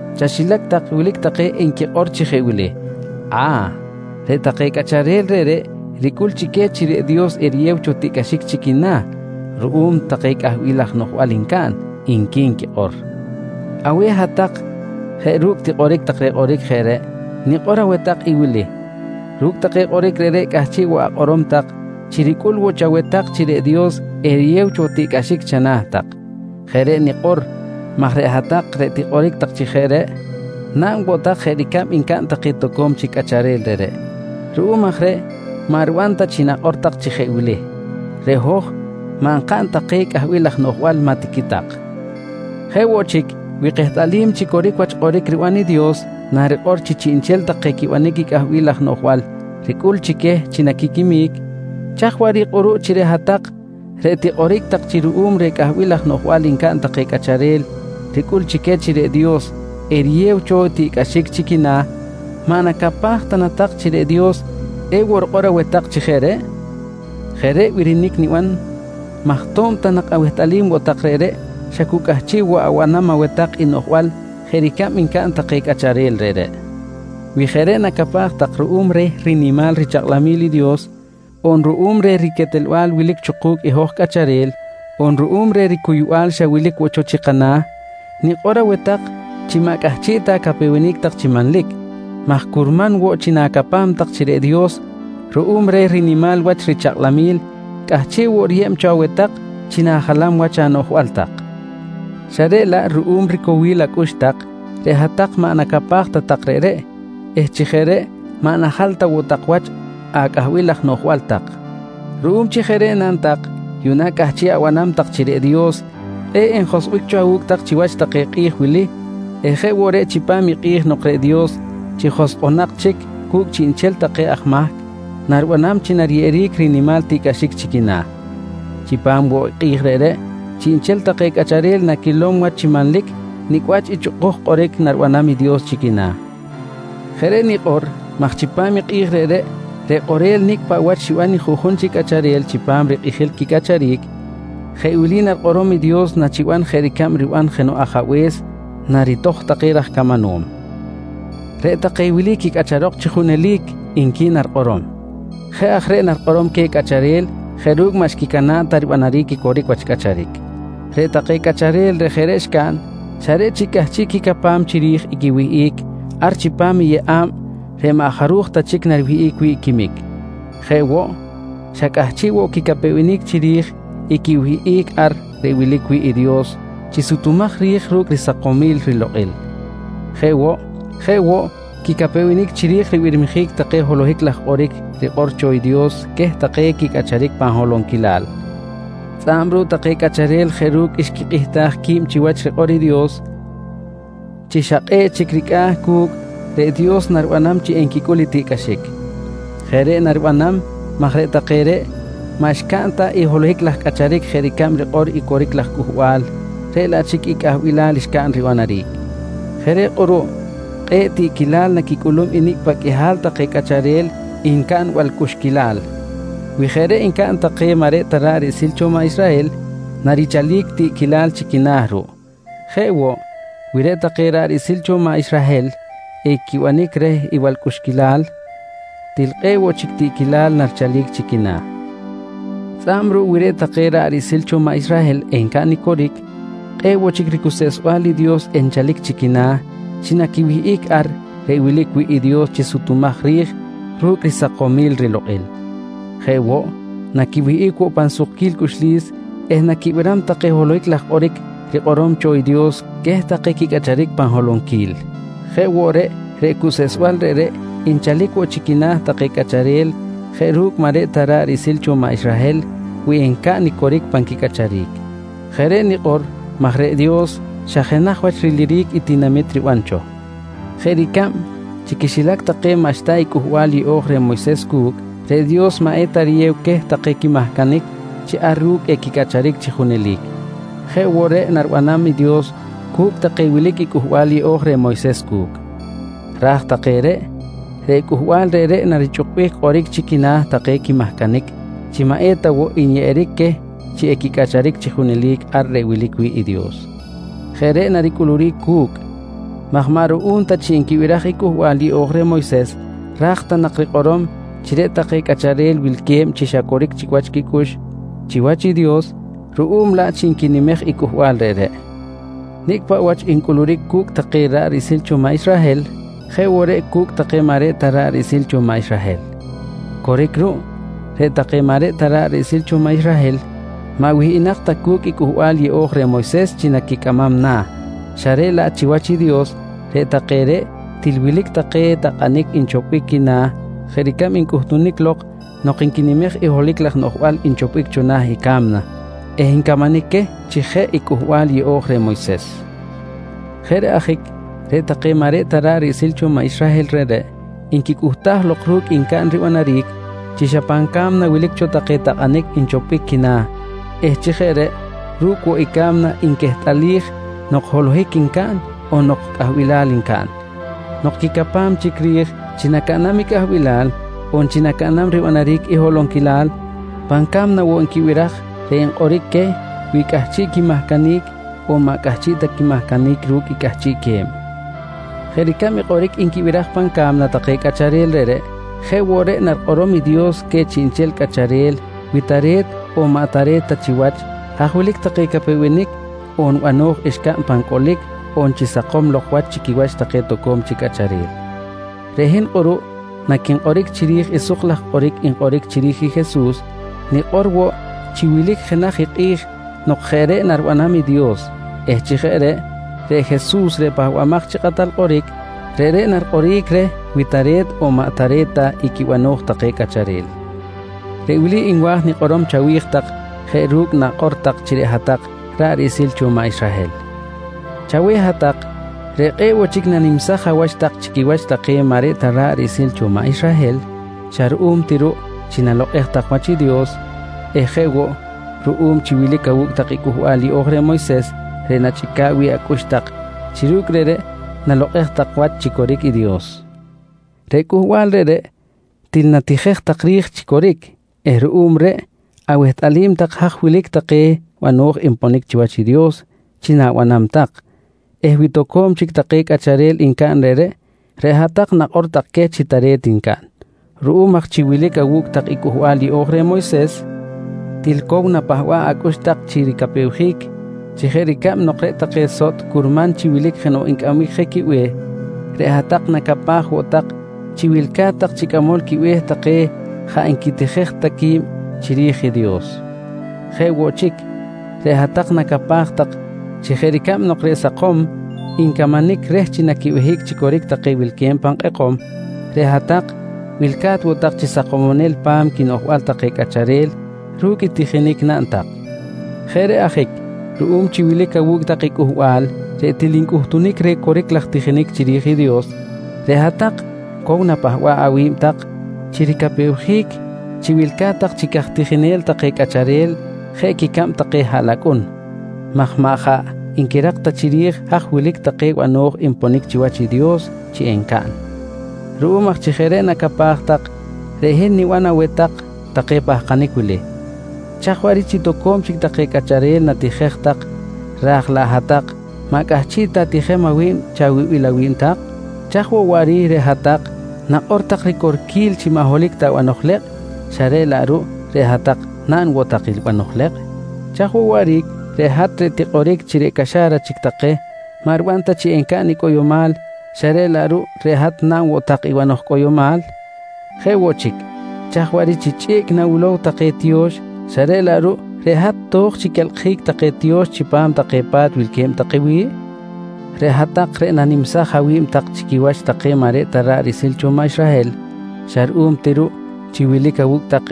Chaxilac tak wilic take nquikꞌor chi jeꞌ wili: «A̱, reꞌ take cꞌacharel reꞌreꞌ ricꞌul chi queh chi reꞌ Dios eriyew cho tiꞌcꞌaxic chi quina̱ ruꞌum take cꞌahbil laj noꞌjbal ncaꞌn, nqui nquikꞌor. Aweh hat-tak jeꞌ ru̱cꞌ tikꞌoric tak reh kꞌoric jeꞌ reꞌ, nikꞌor aweh tak i wili: Ru̱cꞌ take kꞌoric reꞌreꞌ cꞌahchiꞌ woꞌ akꞌorom tak chi ricꞌul woꞌ chaweh tak chi reꞌ Dios eriyew cho tiꞌcꞌaxic chana̱ tak. Jeꞌ reꞌ nikꞌor maj reꞌ hat-tak reꞌ tikꞌoric tak chi jeꞌ reꞌ naꞌn woꞌ tak jeꞌ ricab ncaꞌn take toco̱m chic cꞌacharel reꞌreꞌ. Ruꞌum aj reꞌ maꞌ riban ta chi nakꞌor tak chi jeꞌ wili: «Reꞌ hoj maꞌ nkaꞌn ta keh cꞌahbil laj noꞌjbal, maꞌ tiqui tak. Jeꞌ woꞌ chic, wi kehtꞌalim chi coric wach kꞌoric riban i Dios narikꞌor chi chiꞌnchel take quibanic i cꞌahbil laj noꞌjbal ricꞌul chi queh chi naquiquimic, chaj waꞌric kꞌuruꞌ chi reꞌ hat-tak reꞌ tikꞌoric tak chi ruꞌum reh cꞌahbil laj noꞌjbal ncaꞌn take cꞌacharel ricꞌul chi queh chi reꞌ Dios eriyew cho tiꞌcꞌaxic chi quina̱, maꞌ nacapaj ta na tak chi reꞌ Dios ewoꞌ rikꞌor aweh tak chi jeꞌ reꞌ? Jeꞌ reꞌ i birinic niban maj to̱b ta nak awehtꞌalim woꞌ tak reꞌreꞌ xa cu cꞌahchiꞌ woꞌ abanam aweh tak i noꞌjbal jeꞌ ricab ncaꞌn take cꞌacharel reꞌreꞌ. Wi jeꞌ reꞌ nacapaj tak ruꞌum reh rinimal richakꞌlamil i Dios, on ruꞌum reh riquetelbal wilic cho ku̱cꞌ i hoj cꞌacharel, on ruꞌum reh ricuybal xa wilic woꞌ cho chi kana̱, nikꞌor aweh tak chi maꞌ cꞌahchiꞌ ta acapewenic tak chi manlic maj curman woꞌ chi na̱capam tak chi reꞌ Dios ruꞌum reh rinimal wach richakꞌlamil, cꞌahchiꞌ woꞌ riyeb cho aweh tak chi na̱jalam wach anoꞌjbal tak. Xa reꞌ laꞌ ruꞌum ricowil acꞌux tak, reꞌ hat-tak maꞌ nacapaj ta tak reꞌreꞌ eh chi jeꞌ reꞌ maꞌ jaꞌ najal ta woꞌ wach acꞌahbil laj noꞌjbal tak. Ruꞌum chi jeꞌ reꞌ naꞌn tak, yuꞌna cꞌahchiꞌ abanam tak chi reꞌ Dios kꞌe̱ꞌ enjoskꞌbic cho awu̱cꞌ tak chiwach take kꞌi̱j wili eh jeꞌ woꞌ reꞌ chipam i kꞌi̱j nok reꞌ Dios chi joskꞌonak chic cu̱cꞌ chiꞌnchel take aj mahc, naribanam chi nariyeꞌeric rinimal tiꞌcꞌaxic chi quina̱. Chipam woꞌ i kꞌi̱j reꞌreꞌ, chiꞌnchel take cꞌacharel naquilom wach chi manlic nicꞌ wach i chꞌukuj kꞌoric naribanam i Dios chi quina̱. Jeꞌ reꞌ nikꞌor maj chipam i kꞌi̱j reꞌreꞌ, reꞌ kꞌorel nicꞌ paꞌ wach xiban i juꞌjun chi cꞌacharel chipam rikꞌijil quicꞌacharic, jeꞌ wili narikꞌorom i Dios nachiban jeꞌ ricab riban jenoꞌ ajabe̱s naritoj take raj camanom: «Reꞌ take wili quicꞌacharok chi junelic, nqui narikꞌorom. Jeꞌ aj reꞌ narikꞌorom queh cꞌacharel jeꞌ ru̱cꞌ maꞌ xquicana̱ꞌ ta ribanaric i coric wach cꞌacharic. Reꞌ take cꞌacharel reꞌ jeꞌ reꞌ xcaꞌn, xa reꞌ chic cꞌahchiꞌ quicapam chiri̱j i quiwihꞌic ar chipam i yeꞌa̱b reꞌ maꞌ jaruj ta chic nariwihꞌic wi̱ꞌ quimic. Jeꞌ woꞌ, xa cꞌahchiꞌ woꞌ quicapewenic chiri̱j i quiwihꞌic ar reꞌ wilic wi̱ꞌ i Dios chi sutumaj ri̱j ru̱cꞌ risakomil rilokꞌil. Jeꞌ woꞌ, quicapewenic ncaꞌn chiri̱j ribirmijic take holohic laj kꞌoric rikꞌor cho i Dios queh take quicꞌacharic pan holonquilal. Tzꞌa̱b ruꞌ take cꞌacharel jeꞌ ru̱cꞌ xquikꞌihtaj qui̱b chiwach rikꞌor i Dios, chi xa kꞌe̱ꞌ chic ricꞌa̱ cu̱cꞌ reꞌ Dios naribanam chi enquicꞌul i tiꞌcꞌaxic. Jeꞌ reꞌ naribanam maj reꞌ take reꞌ maꞌ xcaꞌn ta i holohic laj cꞌacharic jeꞌ ricab rikꞌor i coric laj cꞌuhbal reꞌ laꞌ chic i cꞌahbilal xcaꞌn ribanaric. Jeꞌ reꞌ kꞌuruꞌ kꞌe̱ꞌ tiꞌquilal naquicꞌulum i nicꞌ paꞌ qꞌuihal take cꞌacharel ncaꞌn i balcꞌuxquilal. Wi jeꞌ reꞌ ncaꞌn take maꞌ reꞌ ta ra̱ꞌ riꞌsil cho maꞌ Israhel narichalic tiꞌquilal chi quina̱ ruꞌ. Jeꞌ woꞌ, wi reꞌ take ra̱ꞌ riꞌsil cho maꞌ Israhel equibanic reh i balcꞌuxquilal, til kꞌe̱ꞌ woꞌ chic tiꞌquilal narichalic chi quina̱. Tzꞌa̱b ruꞌ wi reꞌ take ra̱ꞌ riꞌsil cho maꞌ Israhel encaꞌn i coric, kꞌe̱ꞌ woꞌ chic ricuseꞌsbal i Dios enchalic chi quina̱ chi naquiwihꞌic ar reꞌ wilic wi̱ꞌ i Dios chi sutumaj ri̱j ru̱cꞌ risakomil rilokꞌil. Jeꞌ woꞌ, naquiwihꞌic woꞌ pan sukquil cꞌuxlis eh naquibiram take holohic laj kꞌoric rikꞌorom cho i Dios queh take quicꞌacharic pan holonquil. Jeꞌ woꞌ reꞌ, reꞌ cuseꞌsbal reꞌreꞌ nchalic woꞌ chi quina̱ take cꞌacharel jeꞌ ru̱cꞌ maꞌ reꞌ ta ra̱ꞌ riꞌsil cho maꞌ Israhel wi encaꞌn i coric pan quicꞌacharic. Jeꞌ reꞌ nikꞌor maj reꞌ Dios xa jenaj wach riliric i tinamit riban cho. Jeꞌ ricab, chi quixilac take maꞌxta i Cꞌuhbal Yeꞌo̱j reh Moyses cu̱cꞌ, reꞌ Dios maꞌ eta riyew queh take quimahcanic chi ar ru̱cꞌ equicꞌacharic chi junelic. Jeꞌ woꞌ reꞌ naribanam i Dios cu̱cꞌ take wilic i Cꞌuhbal Yeꞌo̱j reh Moyses cu̱cꞌ. Raj take reꞌ, reꞌ cꞌuhbal reꞌreꞌ narichꞌukbic kꞌoric chi quina̱ take quimahcanic chi maꞌ eta woꞌ nyeꞌeric queh chi equicꞌacharic chi junelic ar reꞌ wilic wi̱ꞌ i Dios. Jeꞌ reꞌ naricꞌuluric cu̱cꞌ maj maꞌ ruꞌum ta chi nquibiraj i Cꞌuhbal Yeꞌo̱j reh Moyses ra̱j ta nak rikꞌorom chi reꞌ take cꞌacharel wilque̱b chi xa coric chic wach quicꞌux chiwach i Dios ruꞌum laꞌ chi nquinimej i cꞌuhbal reꞌreꞌ. Nicꞌ paꞌ wach ncꞌuluric cu̱cꞌ take ra̱ꞌ riꞌsil cho maꞌ Israhel jeꞌ woꞌ reꞌ cu̱cꞌ take maꞌ reꞌ ta ra̱ꞌ riꞌsil cho maꞌ Israhel. Coric ruꞌ, reꞌ take maꞌ reꞌ ta ra̱ꞌ riꞌsil cho maꞌ Israhel maꞌ wihꞌinak ta cu̱cꞌ i Cꞌuhbal Yeꞌo̱j reh Moyses chi naquicꞌamam na̱, xa reꞌ laꞌ chiwach i Dios reꞌ take reꞌ til wilic take takꞌanic nchopbic quina̱ jeꞌ ricab ncꞌuhtunic lok nok nquinimej i holohic laj noꞌjbal nchopbic cho na̱ i ca̱mna eh ncamanic queh chi jeꞌ i Cꞌuhbal Yeꞌo̱j reh Moyses. Jeꞌ reꞌ ajic reꞌ take maꞌ reꞌ ta ra̱ꞌ riꞌsil cho maꞌ Israhel reꞌreꞌ nquicꞌuhtaj lok ru̱cꞌ ncaꞌn ribanaric chi xa pan ca̱mna wilic cho take takꞌanic nchopbic quina̱ eh chi jeꞌ reꞌ ru̱cꞌ woꞌ i ca̱mna nquehtꞌalij nok holohic ncaꞌn on nok cꞌahbilal ncaꞌn. Nok quicapam chic ri̱j chi nacaꞌnam i cꞌahbilal on chi nacaꞌnam ribanaric i holonquilal, pan ca̱mna woꞌ nquibiraj wi̱ꞌ reꞌ nkꞌoric queh wi cꞌahchiꞌ quimahcanic on maꞌ cꞌahchiꞌ ta quimahcanic ru̱cꞌ i cꞌahchiꞌque̱b. Jeꞌ ricab i kꞌoric nquibiraj pan ca̱mna take cꞌacharel reꞌreꞌ, jeꞌ woꞌ reꞌ narikꞌorom i Dios queh chiꞌnchel cꞌacharel wi tare̱t on maꞌ tare̱t ta chiwach haj wilic take capewenic on bano̱j xcaꞌn pan cꞌolic on chi sakom lok wach chi quiwach take toco̱m chic cꞌacharel. Reꞌ hin kꞌuruꞌ naquinkꞌoric chiri̱j i suk laj kꞌoric nkꞌoric chiri̱j i Jesus, nikꞌor woꞌ chi wilic jenaj i kꞌi̱j nok jeꞌ reꞌ naribanam i Dios eh chi jeꞌ reꞌ, reꞌ Jesus reꞌ Pahbamaj chi Kꞌatal Kꞌoric, reꞌreꞌ narikꞌoric reh wi tare̱t on maꞌ tare̱t ta i quibano̱j take cꞌacharel. Reꞌ wili nwa̱j nikꞌorom chawi̱j tak jeꞌ ru̱cꞌ nakꞌor chi hat-tak ra̱ꞌ riꞌsil cho maꞌ Israhel: Chaweh hat-tak reꞌ kꞌe̱ꞌ woꞌ chic nanimsaj awach tak chi quiwach take maꞌ reꞌ ta ra̱ꞌ riꞌsil cho maꞌ Israhel xa ruꞌum ti ruꞌ chi nalokꞌej tak wach i Dios eh jeꞌ woꞌ ruꞌum chi wilic awu̱cꞌ tak i Cꞌuhbal Yeꞌo̱j reh Moyses reꞌ nachꞌica̱ꞌ wi̱ꞌ acꞌux tak chi ru̱cꞌ reꞌreꞌ nalokꞌej tak wach chi coric i Dios. Reꞌ cꞌuhbal reꞌreꞌ til natijej tak ri̱j chi coric eh ruꞌum reꞌ awehtꞌalim tak haj wilic take bano̱j nponic chiwach i Dios chi na̱banam tak eh wi toco̱m chic take cꞌacharel ncaꞌn reꞌreꞌ, reꞌ hat-tak nakꞌor tak queh chi tare̱t ncaꞌn. Ruꞌum aj chi wilic awu̱cꞌ tak i Cꞌuhbal Yeꞌo̱j reh Moyses til cow na̱pahba̱b acꞌux tak chi ricapewjic chi jeꞌ ricab nok reꞌ take sotꞌ curman chi wilic jenoꞌ ncꞌambic je quibe̱h, reꞌ hat-tak nacapaj woꞌ tak chi wilca̱t tak chi cꞌamol quibe̱h take jaꞌ nquitijej ta qui̱b chiri̱j i Dios. Jeꞌ woꞌ chic, reꞌ hat-tak nacapaj tak chi jeꞌ ricab nok reꞌ sakom ncamanic reh chi naquibehic chi coric take wilque̱b pan kꞌekom, reꞌ hat-tak wilca̱t woꞌ tak chi sakomonel pa̱m quinoꞌjbal take cꞌacharel ru̱cꞌ i tijinic naꞌn tak. Jeꞌ reꞌ ajic ruꞌum chi wilic awu̱cꞌ tak i cꞌuhbal reꞌ til ncꞌuhtunic reh coric laj tijinic chiri̱j i Dios, reꞌ hat-tak cow napahba̱ꞌ awi̱b tak chi ricapewjic chi wilca̱t tak chi caj tijinel take cꞌacharel jeꞌ quicab take haꞌlacꞌun maj maꞌ jaꞌ nquirak ta chiri̱j haj wilic take bano̱j nponic chiwach i Dios chi encaꞌn. Ruꞌum aj chi jeꞌ reꞌ nacapaj tak, reꞌ hin niban aweh tak take pahkanic wili: Chaj waꞌric chi toco̱m chic take cꞌacharel natijej tak raj laꞌ hat-tak maꞌ cꞌahchiꞌ ta atijem awi̱b chawibil awi̱b tak? Chaj woꞌ waꞌric reꞌ hat-tak nakꞌor tak ricorquil chi maꞌ holohic ta banoj lekꞌ, xa reꞌ laꞌ ruꞌ reꞌ hat-tak naꞌn woꞌ tak i banoj lekꞌ? Chaj woꞌ waꞌric reꞌ hat reꞌ tikꞌoric chi reꞌ caxa̱ra chic take maꞌ riban ta chi encaꞌn i cꞌoyomal, xa reꞌ laꞌ ruꞌ reꞌ hat naꞌn woꞌ tak i banoj cꞌoyomal? Jeꞌ woꞌ chic, chaj waꞌric chi chꞌiꞌc nawilow take tiyo̱x xa reꞌ laꞌ ruꞌ reꞌ hat to̱j chi quelkꞌjic take tiyo̱x chipam take pa̱t wilque̱b take wi̱ꞌ? Reꞌ hat-tak reꞌ nanimsaj awi̱b tak chi quiwach take maꞌ reꞌ ta ra̱ꞌ riꞌsil cho maꞌ Israhel xa ruꞌum ti ruꞌ chi wilic awu̱cꞌ tak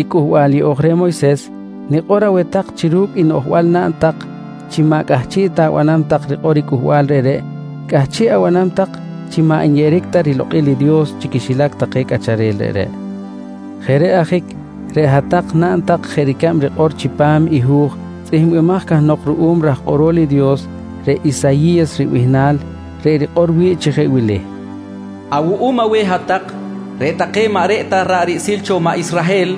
i Cꞌuhbal Yeꞌo̱j reh Moyses nikꞌor aweh tak chi ru̱cꞌ i noꞌjbal naꞌn tak chi maꞌ cꞌahchiꞌ ta abanam tak rikꞌor i cꞌuhbal reꞌreꞌ cꞌahchiꞌ abanam tak chi maꞌ nyeꞌeric ta rilokꞌil i Dios chi quixilac take cꞌacharel reꞌreꞌ. Jeꞌ reꞌ ajic reꞌ hat-tak naꞌn tak jeꞌ ricab rikꞌor chipam i hu̱j tzꞌihmbaj cahnok ruꞌum raj kꞌorol i Dios reꞌ Isayi̱yas ribihnal reꞌ rikꞌor wi̱ꞌ chi jeꞌ wili: «Awuꞌum aweh hat-tak, reꞌ take maꞌ reꞌ ta ra̱ꞌ riꞌsil cho maꞌ Israhel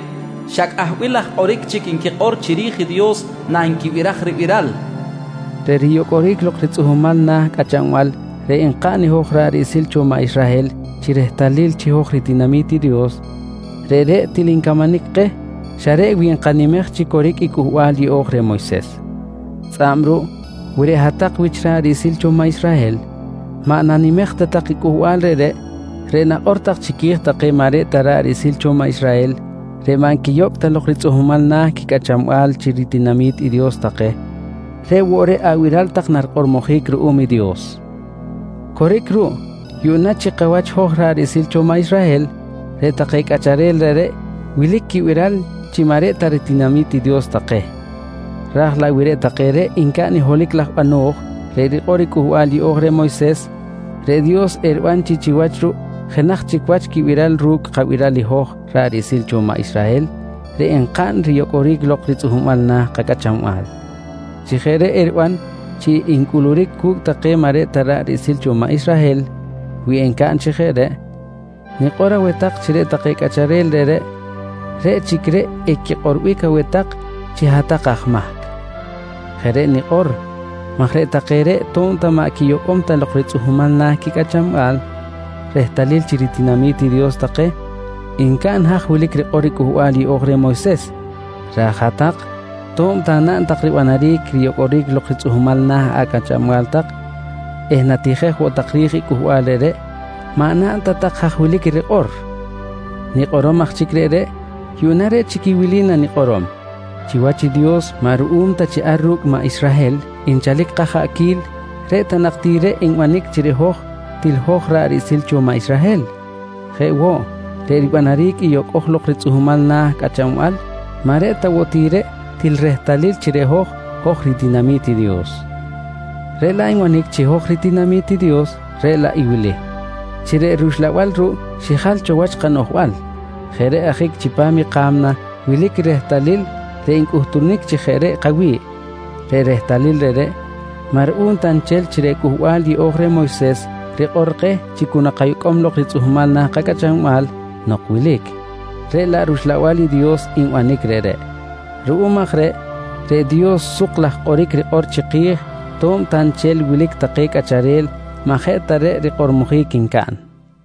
xa cꞌahbil laj kꞌoric chic nquikꞌor chiri̱j i Dios nanquibiraj ribiral, nqui rikꞌor. Reꞌ riyocꞌoric lok ritzꞌuhmal na̱ cꞌachanbal reꞌ nkaꞌn hoj ra̱ꞌ riꞌsil cho maꞌ Israhel chi rehtalil chi hoj ritinami̱t i Dios, reꞌreꞌ til ncamanic keh xa reꞌ wi nkanimej chi coric i Cꞌuhbal Yeꞌo̱j reh Moyses. Tzꞌa̱b ruꞌ wi reꞌ hat-tak wich ra̱ꞌ riꞌsil cho maꞌ Israhel maꞌ nanimej ta tak i cꞌuhbal reꞌreꞌ, reꞌ nakꞌor tak chiqui̱j take maꞌ reꞌ ta ra̱ꞌ riꞌsil cho maꞌ Israhel reꞌ maꞌ nquiyocꞌ ta lok ritzꞌuhmal na̱ quicꞌachanbal chi ritinami̱t i Dios take reꞌ woꞌ reꞌ abiral tak narikꞌormojic ruꞌum i Dios. Coric ruꞌ, yuꞌna chi kawach hoj ra̱ꞌ riꞌsil cho maꞌ Israhel reꞌ take cꞌacharel reꞌreꞌ wilic quibiral chi maꞌ reꞌ ta ritinami̱t i Dios take raj laꞌ wi reꞌ take reꞌ ncaꞌn i holohic laj bano̱j reꞌ rikꞌor i Cꞌuhbal Yeꞌo̱j reh Moyses, reꞌ Dios eriban chi chiwach ruꞌ jenaj chic wach quibiral ru̱cꞌ i kabiral i hoj ra̱ꞌ riꞌsil cho maꞌ Israhel reꞌ nkaꞌn riyocꞌoric lok ritzꞌuhmal na̱ kacꞌachanbal. Chi jeꞌ reꞌ eriban chi ncꞌuluric cu̱cꞌ take maꞌ reꞌ ta ra̱ꞌ riꞌsil cho maꞌ Israhel wi ncaꞌn chi jeꞌ reꞌ, nikꞌor aweh tak chi reꞌ take cꞌacharel reꞌreꞌ, reꞌ chic reꞌ equikꞌorbic aweh tak chi hat-tak aj mahc. Jeꞌ reꞌ nikꞌor maj reꞌ take reꞌ to̱b ta maꞌ quiyocꞌom ta lok ritzꞌuhmal na̱ quicꞌachanbal rehtalil chi ritinami̱t i Dios take, ncaꞌn haj wilic rikꞌor i Cꞌuhbal Yeꞌo̱j reh Moyses raj i hat-tak to̱b ta naꞌn tak ribanaric riyocꞌoric lok ritzꞌuhmal na̱ acꞌachanbal tak eh natijej woꞌ tak ri̱j i cꞌuhbal reꞌreꞌ, maꞌ naꞌn ta tak haj wilic i rikꞌor. Nikꞌorom aj chic reꞌreꞌ yuꞌna reꞌ chic i wili nanikꞌorom: Chiwach i Dios maꞌ ruꞌum ta chi ar ru̱cꞌ i maꞌ Israhel nchalic kajaꞌquil reꞌ ta nak ti reꞌ nbanic chi reꞌ hoj til hoj ra̱ꞌ riꞌsil cho maꞌ Israhel. Jeꞌ woꞌ, reꞌ ribanaric i yocꞌo̱j lok ritzꞌuhmal na̱ cꞌachanbal maꞌ reꞌ ta woꞌ ti reꞌ til rehtalil chi reꞌ hoj, hoj ritinami̱t i Dios. Reꞌ laꞌ nbanic chi hoj ritinami̱t i Dios reꞌ laꞌ wili: Chi reꞌ rUxlabal ruꞌ xijal cho wach kanoꞌjbal. Jeꞌ reꞌ ajic chipam i ka̱mna wilic i rehtalil reꞌ ncꞌuhtunic chi jeꞌ reꞌ kawi̱ꞌ. Reꞌ rehtalil reꞌreꞌ maꞌ ruꞌum ta nchel chi reꞌ Cꞌuhbal Yeꞌo̱j reh Moyses rikꞌor keh chi cu nakayocꞌom lok ritzꞌuhmal na̱ kacꞌachanbal nok wilic, reꞌ laꞌ rUxlabal i Dios nbanic reꞌreꞌ. Ruꞌum aj reꞌ, reꞌ Dios suk laj kꞌoric rikꞌor chiki̱j to̱b ta nchel wilic take cꞌacharel maꞌ jeꞌ ta reꞌ rikꞌormojic ncaꞌn.